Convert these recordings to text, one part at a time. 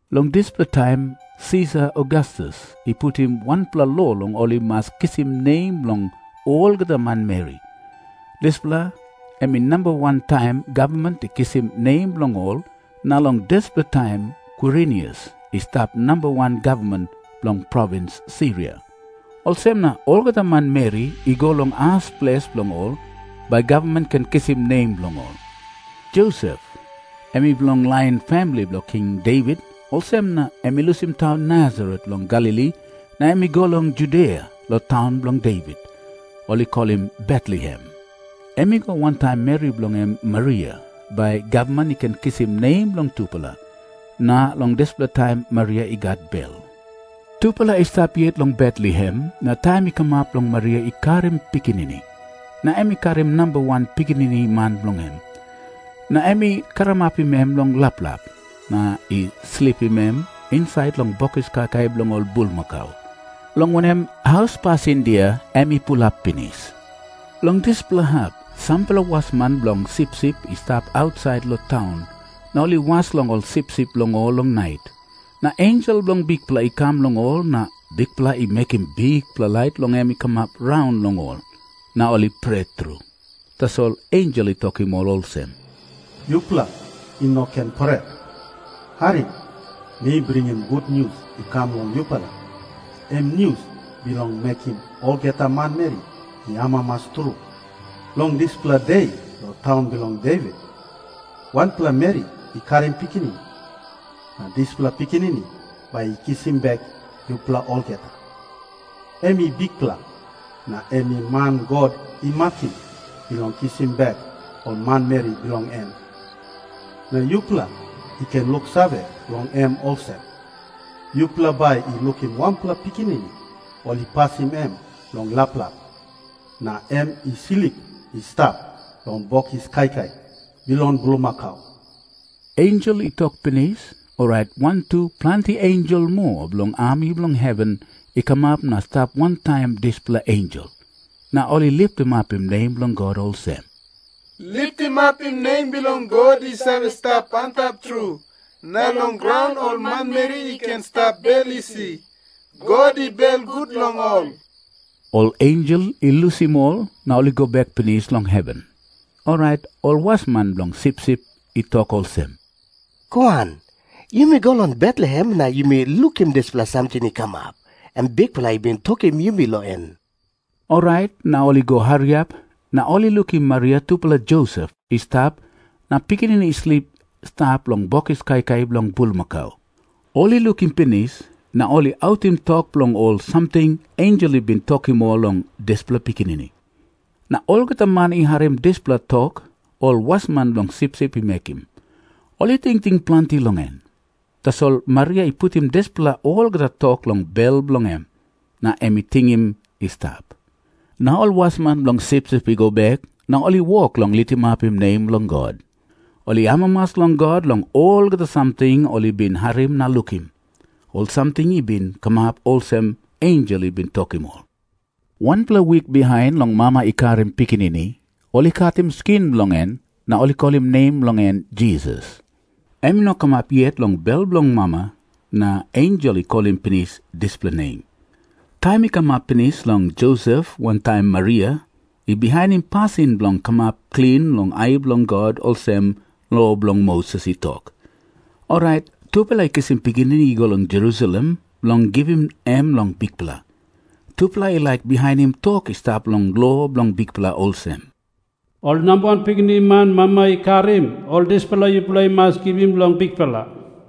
Long dispela taim Sisar Ogastus i putim wanpela lo long ol i mas kisim nem bilong olgeta manmeri. Dispela em i namba wan taim gavman i kisim nem bilong ol, na long dispela taim Kwirinius i stap namba wan gavman bilong provins Siria. Olsem na olgeta manmeri i go long as ples bilong ol, bai gavman i ken kisim nem bilong ol. Josep em i bilong lain famili bilong King Devit. Olsem na em i lusim taun Nasaret long Galili, na em i go long Judia long taun bilong Devit, ol i kolim Betlehem. Em i go wantaim meri bilong en Maria, bai gavman i ken kisim nem bilong tupela. Na long dispela taim Maria i gat bel. Tupela i stap yet long Betlehem, na taim i kamap bilong Maria i karim pikinini. Na em i karim namba wan pikinini man bilong en. Na em i karamapim em long laplap, na i slipim em insait long bokis kaikai bilong ol bulmakau, long wanem, haus pasindia em i pulap pinis. Long dispela hap sampela wasman bilong sipsip i stap ausait long taun, na ol i was long ol sipsip bilong ol long nait. Na ensel bilong Bikpela i kam long ol, na Bikpela i mekim bikpela lait bilong en i kamap raun long ol, na ol i pret tru. Tasol ensel i tokim ol olsem, "Yupela i no ken pret. Harim. Mi bringim gutnius i kam long yupela, em nius bilong mekim olgeta manmeri i amamas tru. Long dispela de long taun bilong Devit, wanpela meri i karim pikinini. Na dispela pikinini bai i kisim bek yupela olgeta. Em i Bikpela, na em i man God i makim bilong kisim bek ol manmeri bilong en. Na yupela i ken luksave long em olsem. Yupela bai i lukim wanpela pikinini ol i pasim em long laplap, na em i slip i stap long bokis kaikai bilong bulmakau." Ensel i tok pinis, orait wantu planti ensel moa bilong ami bilong heven i kamap na i stap wantaim dispela ensel. Na ol i litimapim nem bilong God olsem, "Litimapim nem bilong God i save stap antap tru. Na long graun ol manmeri i ken stap bel isi. God i belgut long ol." Ol ensel i lusim ol na i go bek pinis long heven, orait ol wasman bilong sipsip i tok olsem, "Goan, yumi go long Betlehem na yumi lukim dispela samting i kamap, em Bikpela i bin tokim yumi long en." Orait na ol i go hariap, na ol i lukim Maria tupela Josep i stap, na pikinini i slip i stap long bokis kaikai bilong bulmakau. Ol i lukim pinis, na ol i autim tok long ol samting ensel i bin tokim ol long dispela pikinini. Na olgeta man i harim dispela tok ol wasman bilong sipsip i mekim, ol i tingting planti long en. Tasol Maria i putim dispela olgeta tok long bel bilong en, na em i tingim i stap. Na ol wasman bilong sipsip i go bek na ol i wok long litimapim nem bilong God. Ol i amamas long God long olgeta samting ol i bin harim na lukim. Ol samting i bin kamap olsem ensel i bin tokim ol. Wanpela wik bihain long mama i karim pikinini, ol i katim skin bilong en, na ol i kolim nem bilong en Jisas. Em i no kamap yet long bel bilong mama, na ensel i kolim pinis dispela nem. Taim i kamap pinis bilong Josep wantaim Maria i bihainim pasin bilong kamap klin long ai bilong God olsem lo bilong Moses i tok, orait tupela i kisim pikinini i go long Jerusalem bilong givim em long Bikpela. Tupela i laik bihainim tok i stap long lo bilong Bikpela olsem, "Ol namba wan pikinini man mama i karim, ol dispela yupela i mas givim long Bikpela."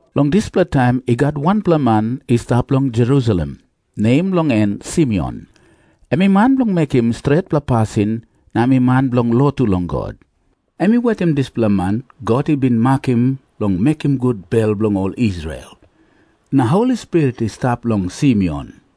Long dispela taim i gat wanpela man i stap long Jerusalem, nem bilong en Simeon. Em i man bilong mekim stretpela pasin na em i man bilong lotu long God. Em i wetim dispela man God i bin makim bilong mekim gut bel bilong ol Israel. Na Holi Spirit i stap long Simeon.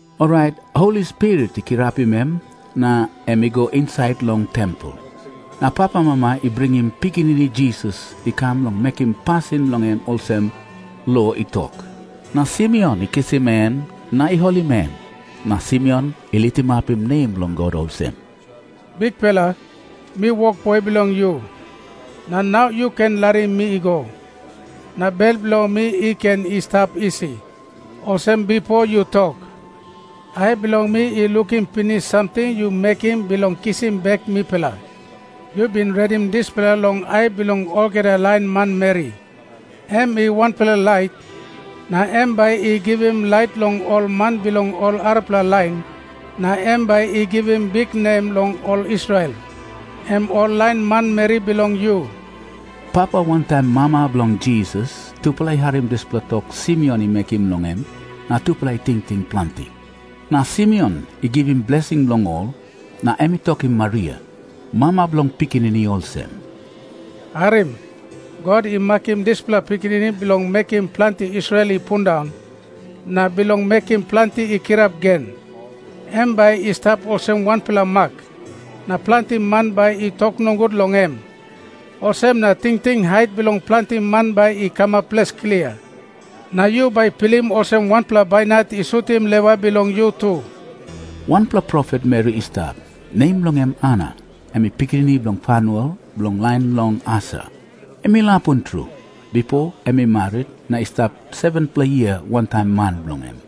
Orait Holi Spirit i kirapim em na em i go insait long tempel. Na papamama i bringim pikinini Jisas i kam bilong mekim pasin long em olsem lo i tok. Na Simeon i kisim em na i holim em. Na Simeon i litimapim nem bilong God olsem, "Bikpela, mi wokboi bilong yu, na nau yu ken larim mi i go, na bel bilong mi i ken i stap isi, olsem bipo yu tok. Ai bilong mi i lukim pinis samting yu mekim bilong kisim bek mipela. Yu bin redim dispela long ai bilong olgeta lain manmeri. Em i wanpela lait, na em bai i givim lait long ol man bilong ol arapela lain, na em bai i givim biknem long ol Israel, em ol lain manmeri bilong yu." Papa wantaim mama bilong Jisas tupela i harim dispela tok Simeon i mekim long em, na tupela i tingting planti. Na Simeon i givim blesing long ol, na em i tokim Maria, mama bilong pikinini, olsem, "Harim. God i makim dispela pikinini bilong mekim planti Israel i pundaun, na bilong mekim planti i kirap gen. Em bai i stap olsem wanpela mak, na planti man bai i tok nogut long em. Olsem na tingting hait bilong planti man bai i kamap ples klia. Na yu bai i stap olsem wanpela bainat i sutim lewa bilong yu tu." Wanpela profet meri i stap, nem bilong en Ana. Em i pikinini bilong Fanuel bilong lain bilong Aser. Em i lapun tru. Bipo em i marit, na i stap 7-pela yia wantaim man bilong en.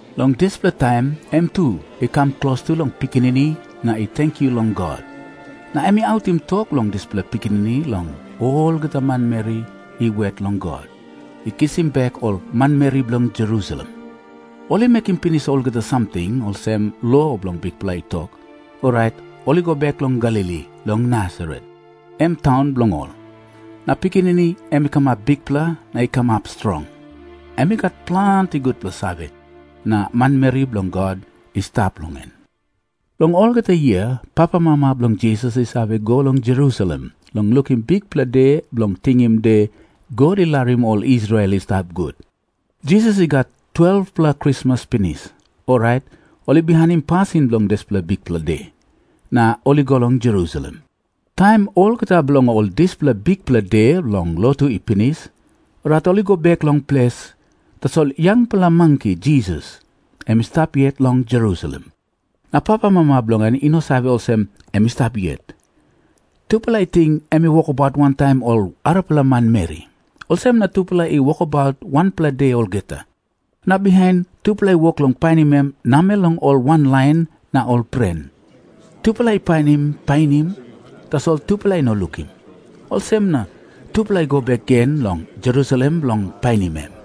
Long dispela taim em tu i kam klostu long pikinini na i tenkyu long God. Na em i autim tok bilong dispela pikinini long olgeta manmeri i wet long God i kisim bek ol manmeri bilong Jerusalem. Ol i mekim pinis olgeta samting olsem lo bilong Bikpela i tok, orait ol i go bek long Galili long Nasaret, em taun bilong ol. Na pikinini em i kamap bikpela na i kamap strong. Em i gat planti gutpela save, na marimari bilong God i stap long em. Long olgeta yia papamama bilong Jisas i save go long Jerusalem bilong lukim Bikpela De Bilong Tingim De God I Larim Ol Israel I Stap Gut. Jisas i gat 12-pela krismas pinis, orait ol i bihainim pasin bilong dispela bikpela de na ol i go long Jerusalem. Taim olgeta bilong ol dispela bikpela de bilong lotu i pinis, orait ol i go bek long ples. Tasol yangpela manki Jisas em i stap yet long Jerusalem. Na papamama bilong en i no save olsem em i stap yet. Tupela i ting em i wokabaut wantaim ol arapela manmeri. Olsem na tupela i wokabaut wanpela de olgeta. Na bihain tupela i wok long painim em namel long ol wanlain na ol pren. Tupela i painim painim, tasol tupela i no lukim. Olsem na tupela i go bek gen long Jerusalem bilong painim em.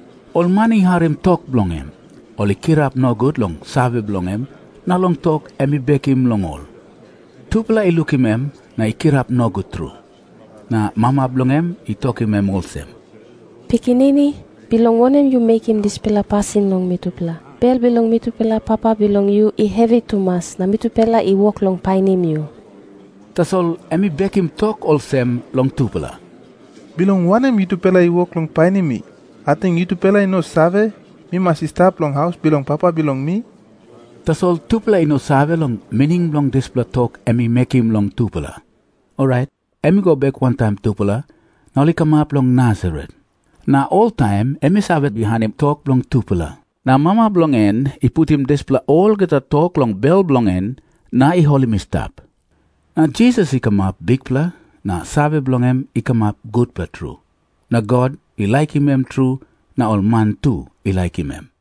Ol man i harim tok bilong en, ol i kirap nogut long save bilong en na long tok em i bekim long ol. Tupela i lukim em na i kirap nogut tru. Na mama bilong en i tokim em olsem, "Pikinini, bilong wanem yu mekim dispela pasin long mitupela? Bel bilong mi tupela papa bilong yu i hevi tumas na mitupela i wok long painim yu." Tasol em i bekim tok olsem long tupela, "Bilong wanem yutupela i wok long painim mi? Ating yutupela i no save, mi mas i stap long haus bilong Papa bilong mi?" Tasol tupela i no save long mining bilong dispela tok em i mekim long tupela. Orait em i go bek wantaim tupela, na ol i kamap long Nasaret, na oltaim em i save bihainim tok bilong tupela. Na mama bilong en i putim dispela olgeta tok long bel bilong en na i holim i stap. Na Jisas i kamap bikpela, na save bilong en i kamap gutpela tru. Na God i laikim em tru na ol man tu i laikim em.